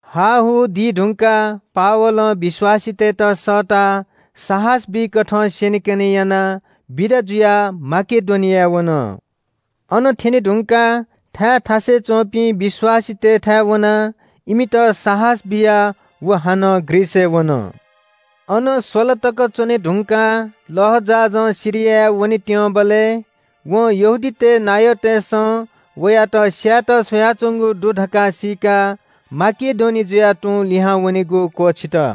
हाहू दी धुंकाः पावलं विश्‍वासीतय्‌त सःताः साहस बीकथं स्‍यनेकने यानाः बिदा जुयाः माकेडोनियाय् वन। अन थ्‍यने धुंकाः थाय् थासय् च्‍वंपिं विश्‍वासीतय् थाय् वनाः इमित साहस बियाः व हानं ग्रीसय् वन। अन स्‍वला तक च्‍वने धुंकाः लःजहाजं सिरियाय् वनेत्‍यंबलय् वं यहूदीतय् नायःतय्‌सं वयात स्‍यायेत स्‍वयाच्‍वंगु दु धकाः सीकाः माकेडोनिया जुयाः तुं लिहां वनेगु क्‍वःछित।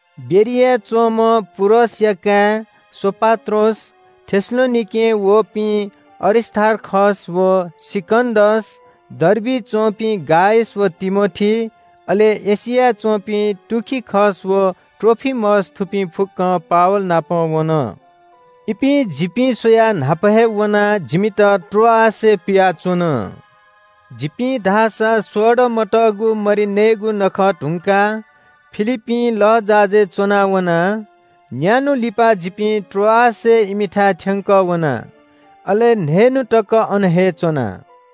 बेरियाय् च्‍वंम्‍ह पुरसया काय् सोपात्रोस, थेसलोनिकें वःपिं अरिस्‍तार्खस व सिकन्‍दस, डर्बिइ च्‍वंपिं गायस व तिमोथी, अले एशियाय् च्‍वंपिं तुखिकस व त्रोफिमस, थुपिं फुक्‍कं पावल नाप वन। इपिं जिपिं स्‍वयाः न्‍हापा हे वनाः जिमित त्रोआसय् पियाच्‍वन। जिपिं धाःसा सोडा मतःगु मरि नयेगु नखः धुंकाः फिलिप्‍पीं लःजहाजय् च्‍वनावना। न्‍यान्‍हु लिपा जिपिं त्रोआसय् इमिथाय् थ्‍यंकः वना, अले न्‍हय्‌न्‍हु तक अन हे च्‍वना।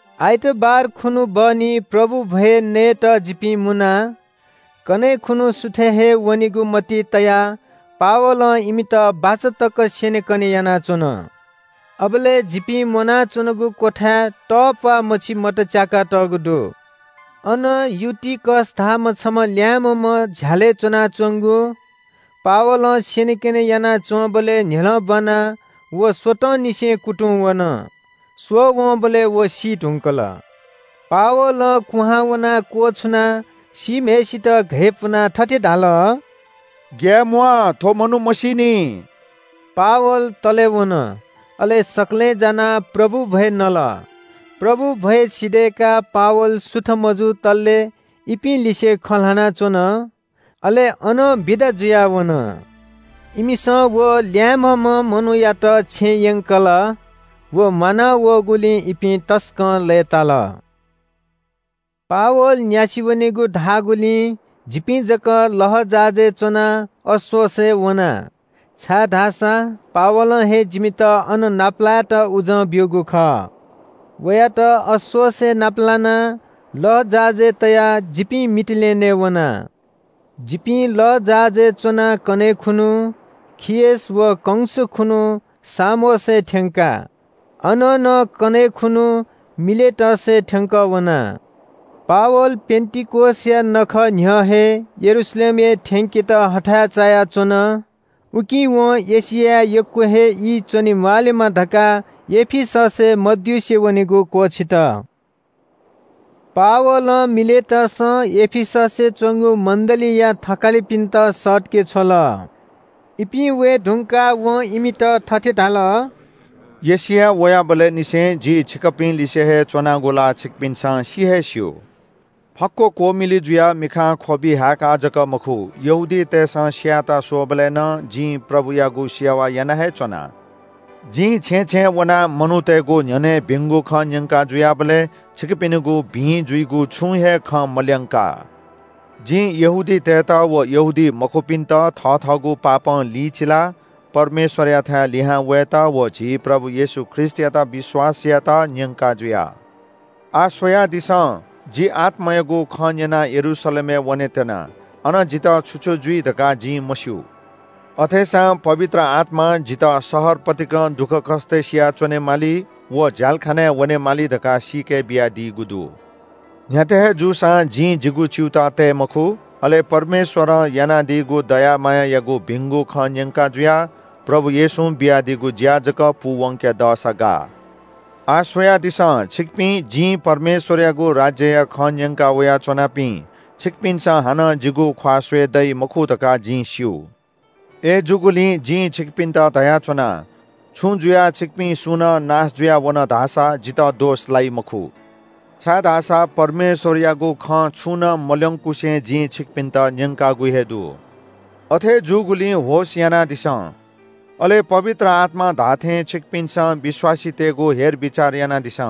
आइतबार खुन्‍हु बहनी प्रभु भ्‍वय् नयेत जिपिं मुना। कन्‍हय् खुन्‍हु सुथय् हे वनेगु मतिइ तयाः पावलं इमित बाचा तक स्‍यनेकने यानाच्‍वन। अबलय् जिपिं मुनाच्‍वनागु क्‍वथाय् तःप्‍वाः मछि मत च्‍याकातःगु दु। अन युटिकस धाःम्‍ह छम्‍ह ल्‍याय्‌म्‍ह झ्‍यालय् च्‍वनाच्‍वंगु। पावलं स्‍यनेकने यानाच्‍वंबलय् न्‍ह्यलं ब्‍वानाः व स्‍वतंनिसें कुतुंवन। स्‍वःवंबलय् व सी धुंकल। पावलं कुहां वनाः क्‍वछुनाः सीम्‍हय्‌सित घय्‌पुनाः थथे धाल – “ग्‍याये म्‍वाः, थ्‍व मनू मसीनि।” पावल तले वन, अले सकलें जानाः प्रभु भ्‍वय् नल। प्रभु भ्‍वय् सिधय्‌काः पावल सुथ मजुतले इपिं लिसे खँ ल्‍हानाच्‍वन। अले अनं बिदा जुयाः वन। इमिसं व ल्‍याय्‌म्‍हम्‍ह मनूयात छेँय् यंकल। व म्‍वाना वःगुलिं इपिं तसकं लय्‌ताल। पावल न्‍यासि वनेगु धाःगुलिं जिपिं जक लःजहाजय् च्‍वनाः अस्‍सोसय् वना, छाय्‌धाःसा पावलं हे जिमित अन नापलायेत उजं ब्‍यूगु खः। वयात अस्‍सोसय् नाप लानाः लःजहाजय् तयाः जिपिं मितिलेनेय् वना। जिपिं लःजहाजय् च्‍वनाः कन्‍हय् खुन्‍हु खियस व कंस खुन्‍हु सामोसय् थ्‍यंका। अनं नं कन्‍हय् खुन्‍हु मिलेटसय् थ्‍यंकः वना। पावल पेन्‍तिकोसया नखः न्‍ह्यः हे यरूशलेमय् थ्‍यंकेत हथाय् चायाच्‍वन। उकिं वं एशियाय् यक्‍व ई च्‍वने म्‍वाःलेमा धकाः एफिससय् मद्युसे वनेगु क्‍वःछित। पावलं मिलेटसं एफिससय् च्‍वंगु मण्‍डलीया थकालिपिन्‍त सःतके छ्वल। इपिं वये धुंकाः वं इमित थथे धाल – “एशियाय् वयाबलय् निसें जि छिकपिं लिसे हे च्‍वनागु ला छिकपिन्‍सं सि हे स्‍यू। फक्‍व क्‍वमिलु जुयाः मिखां ख्‍वबि हाय्‌काः जक मखु, यहूदीतय्‌सं स्‍यायेत स्‍वःबलय् नं जिं प्रभुयागु सेवा याना हे च्‍वना। जिं छेँय् छेँय् वनाः मनूतय्‌गु न्‍ह्यःने भिंगु खँ न्‍यंका जुयाबलय् छिकपिनिगु भिं जुइगु छुं हे खँ मल्‍यंका। जिं यहूदीतय्‌त व यहूदीमखुपिन्‍त पश्‍चाताप यानाः परमेश्‍वरयाथाय् लिहां वयेत व झी प्रभु येशू ख्रीष्‍टयात विश्‍वास यायेत न्‍यंका जुया। “आः स्‍वयादिसँ, जि आत्‍मायागु खँ न्‍यनाः यरूशलेमय् वनेत्‍यना। अन जितः छु छु जुइ धकाः जिं मस्‍यू। अथेसां पवित्र आत्‍मां जितः शहर पतिकं दुःखकष्‍ट सिया च्‍वनेमाली व झ्‍यालखानाय् वनेमाली धकाः सीके बियादीगु दु। न्‍ह्याथे हे जूसां जिं जिगु च्‍यूताः तये मखु, अले परमेश्‍वरं यानादीगु दया मायायागु भिंगु खँ न्‍यंका जुयाः प्रभु येशूं बियादीगु ज्‍या जक पूवंके दःसा गाः।” “आः स्‍वयादिसँ, छिकपिं जिं परमेश्‍वरयागु राज्‍यया खँ न्‍यंका वया च्‍वनापिं, छिकपिन्‍सं हानं जिगु ख्‍वाः स्‍वये दइ मखु धकाः जिं स्‍यू। अय्‌जूगुलिं जिं छिकपिन्‍त धयाच्‍वना – छुं जुयाः छिकपिं सुं नं नाश जुयावन धाःसा जितः दोष लाइ मखु। छाय्‌धाःसा परमेश्‍वरयागु खँ छुं नं मल्‍यंकुसे जिं छिकपिन्‍त न्‍यंकागु हे दु। “अथे जूगुलिं होश यानादिसँ, अले पवित्र आत्‍मां धाःथें छिकपिन्‍सं विश्‍वासीतय्‌गु हेरबिचार यानादिसँ,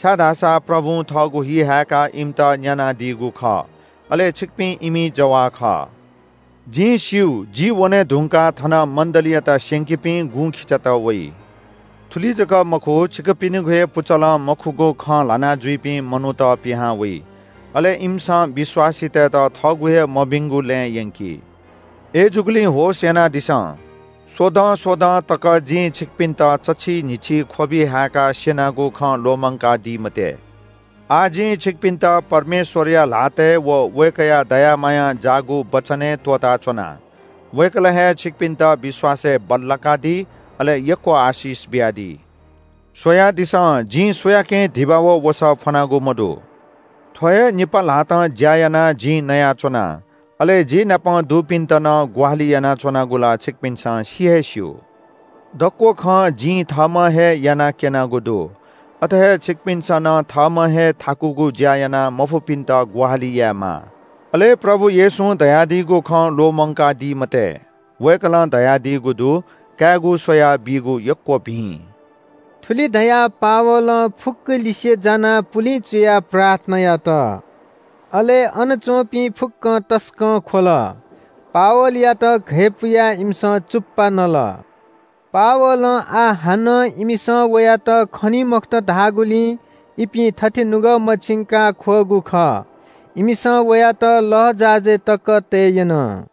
छाय्‌धाःसा प्रभुं थःगु हि हाय्‌काः इमित न्‍यानादीगु खः, अले छिकपिं इमि जवाः खः। जिं स्‍यू, जि वने धुंकाः थन मण्‍डलीयात स्‍यंकीपिं गुँखिचात वइ। थुलि जक मखु, छिकपिनिगु हे पुचलं मखुगु खँ ल्‍हानाजुइपिं मनूत पिहां वइ। अले इमिसं विश्‍वासीतय्‌त थःगु हे मभिंगु लँय् यंकी। अय्‌जूगुलिं होश यानादिसँ, स्‍वदँ स्‍वदँ तक जिं छिकपिन्‍त चच्‍छि न्‍हिच्‍छि ख्‍वबि हाय्‌काः स्‍यनागु खँ ल्‍वःमंकादी मते।” “आः जिं छिकपिन्‍त परमेश्‍वरया ल्‍हातय् व वय्‌कःया दया मायां जाःगु वचनय् त्‍वःताच्‍वना। वय्‌कलं हे छिकपिन्‍त विश्‍वासय् बल्‍लाकादी, अले यक्‍व आशिष बियादी। “स्‍वयादिसँ, जिं सुयाकें धिबा व वसः फ्‍वनागु मदु। थ्‍व हे निपा ल्‍हातं ज्‍या यानाः जिं नयाच्‍वना, अले जि नाप दुपिन्‍त नं ग्‍वाहालि यानाच्‍वनागु ला छिकपिन्‍सं सि हे स्‍यू। दक्‍व खँ जिं थःम्‍हं हे याना क्‍यनागु दु। अथे हे छिकपिन्‍सं नं थःम्‍हं हे थाकुगु ज्‍या यानाः मफुपिन्‍त ग्‍वाहालि यायेमाः। अले प्रभु येशूं धयादीगु खँ ल्‍वःमंकादी मते। वय्‌कलं धयादीगु दु – ‘कायेगु स्‍वयाः बीगु यक्‍व भिं।’” थुलि धयाः पावलं फुक्‍कलिसे जानाः पुलिं चुयाः प्रार्थना यात। अले अन च्‍वंपिं फुक्‍कं तसकं ख्‍वल। पावलयात घय्‌पुयाः इमिसं चुप्‍पा नल। पावलं आः हानं इमिसं वयात खनी मखुत धाःगुलिं इपिं थथे नुगः मछिंकाः ख्‍वःगु खः। इमिसं वयात लःजहाजय् तक तये यन।